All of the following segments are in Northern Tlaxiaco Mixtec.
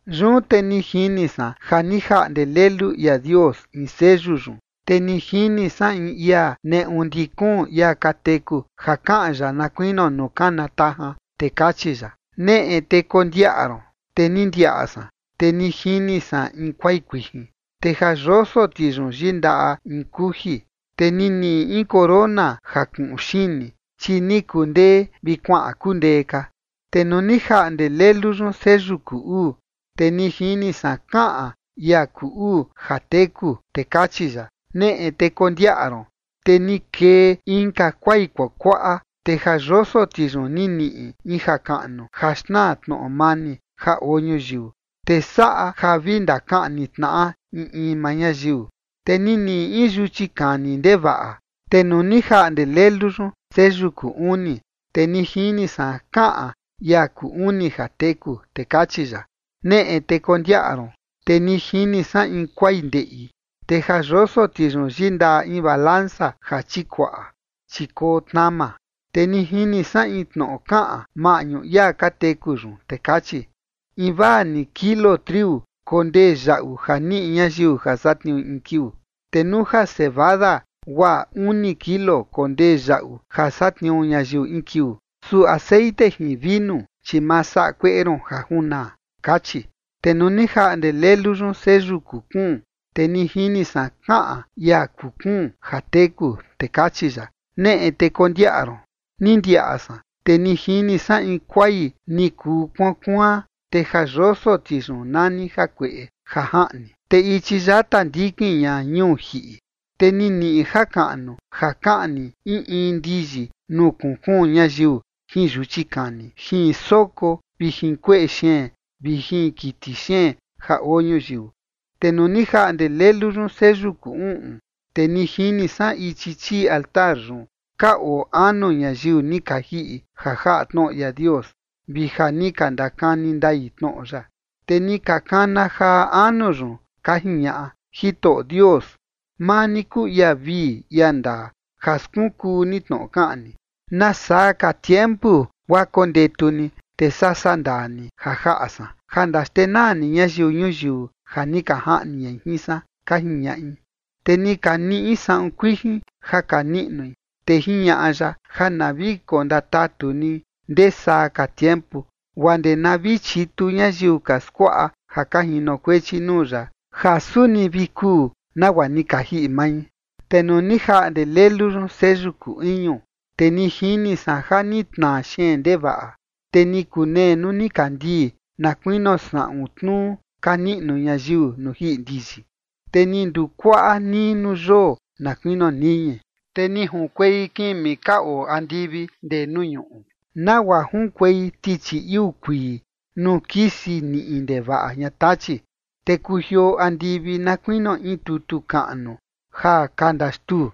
Yun te ni jini san ja ni jaꞌnde Lelu ia Dios in seyu yun, te ni jini san in ia neꞌu ndi kuun ia ka teku ja kaꞌan ya na kuinio nuu kana tajan, te kachi ya: ―Neꞌe, te kondiaꞌa ron. Te ni ndiaꞌa san, te ni jini san in kuai kuijin, te ja yoso ti yun yindaꞌa in kuji. Te ni niꞌi in corona ja kuꞌun xini, chi ni kundee vi kuaꞌan kundee ka. Te nuu ni jaꞌnde Lelu yun seyu kuu uu, te ni jini san kaꞌan ia kuu uu ja teku, te kachi ya: ―Neꞌe, te kondiaꞌa ron. Te ni kee inka kuai kuakuaꞌa, te ja yoso ti yun ni niꞌi in jakaꞌnu ja xnaa tnoꞌo mani ja oo ñuyiu, te saꞌa ja vi ndakaꞌni tnaꞌa in in maa ñayiu. Te ni niꞌi in yuchi kani ndevaꞌa. Te nuu ni jaꞌnde lelu yun seyu kuu uni, te ni jini san kaꞌan ia kuu uni ja teku, te kachi ya: ―Neꞌe, te kondiaꞌa ron. Te ni jini san in kuai ndeꞌi, te ja yoso ti yun yindaꞌa in yutnu jatakuaꞌa, chi koo tnama. Te ni jini san in tnoꞌo kaꞌan maꞌñu ia ka teku yun, te kachi: ―Invaa ni kilo triu kondee yaꞌu ja niꞌi ñayiu ja satniui in kiuu, te nuu ja cebada guaa uni kilo kondee yaꞌu ja satniuu ñayiu in kiuu. Su texeꞌen jin vinu, chi ma saꞌa kueꞌe ron ja junaa ―kachi. Te nuu ni jaꞌnde Lelu yun seyu kuu kuun, te ni jini san kaꞌan ia kuu kuun ja teku, te kachi ya: ―Neꞌe, te kondiaꞌa ron. Ni ndiaꞌa san, te ni jini san in kuai ni kuu kuaan kuaan, te ja yoso ti yun nani jakueꞌe ja jaꞌni, te ichi yata ndikin ña ñuu jiꞌi. Te ni niꞌi jakaꞌnu ja kaꞌni in in ndiyi nuu kuun kuun ñayiu jin yuchi kani, jin soko, vi jin kueꞌe xeen vi jin kiti xeen ja oo ñuyiu. Te nuu ni jaꞌnde Lelu yun seyu kuu uꞌun, te ni jini san ichi chii altar yun ka oo anu ñayiu ni ka jiꞌi ja jaꞌa tnoꞌo ia Dios, vi ja ni ka ndakani ndai tnoꞌo ya. Te ni ka kana jaa anu yun, ka jiñaꞌa: ―Jitoꞌo Dios, maa ni kuu ia vii ia ndaa ja skunkuu ni tnoꞌo kaꞌan ni. ¿Nasaa ka tiempu guaa kondetu ni, te saa sandaa ni ja jaꞌa san, ja ndaxtenaa ni ñayiu ñuyiu ja ni ka jaꞌni ñai jin san? ―ka jiñaꞌi. Te ni ka niꞌi saꞌun kuijin ja ka niꞌnui, te jiñaꞌa ya ja na vi kondatatu ni ndee saa ka tiempu, guaa ndee na vi chitu ñayiu ka skuaꞌa ja ka jinokuechi nuu ya, ja suni vi kuu nagua ni ka jiꞌi mai. Te nuu ni jaꞌnde Lelu yun seyu kuu iñu, te ni jini san ja ni tnaa xeen ndevaꞌa. Te ni kunee nuu nikandii na kuinio saꞌun tnuu ka niꞌnu ñayiu nuu jiꞌi ndiyi, te ni ndukuaꞌa nii nuu yoo na kuinio niñi. Te ni junkuei kimi ka oo andivi ndee nuu ñuꞌu, nagua junkuei tichi iuu kuii nuu kisi niꞌi ndevaꞌa ña tachi. Te kujioo andivi na kuinio in tutu kaꞌnu ja ka ndaxtuu,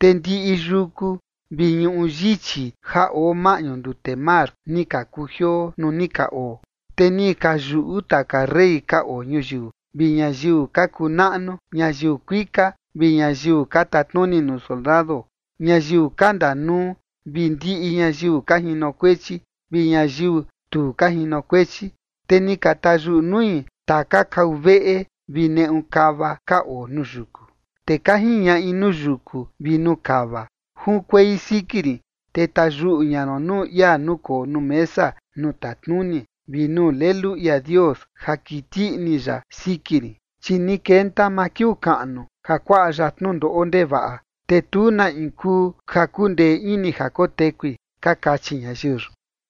te ndiꞌi yuku vi ñuꞌu yichi ja oo maꞌñu ndute mar, ni ka kujioo nuu ni ka oo. Te ni ka yuꞌu taka rey ka oo ñuyiu, vi ñayiu ka kuu naꞌnu, ñayiu kuika, vi ñayiu ka tatnuni nuu soldado, ñayiu ka ndanuu, vi ndiꞌi ñayiu ka jinokuechi, vi ñayiu tu ka jinokuechi, te ni ka tayuꞌu nui taka kau veꞌe vi neꞌu kava ka oo nuu yuku. Te ka jiñaꞌi nuu yuku vi nuu kava: ―Junkuei siki rin, te tayuꞌu ña ron nuu ia nukoo nuu mesa nuu tatnuni, vi nuu Lelu ia Dios ja kiti ini ya siki rin. Chi ni kenta maa kiuu kaꞌnu ja kuaꞌa ya tnundoꞌo ndevaꞌa, te tu na in kuu ja kundee ini ja kotekui ―ka kachi ñayiu yun.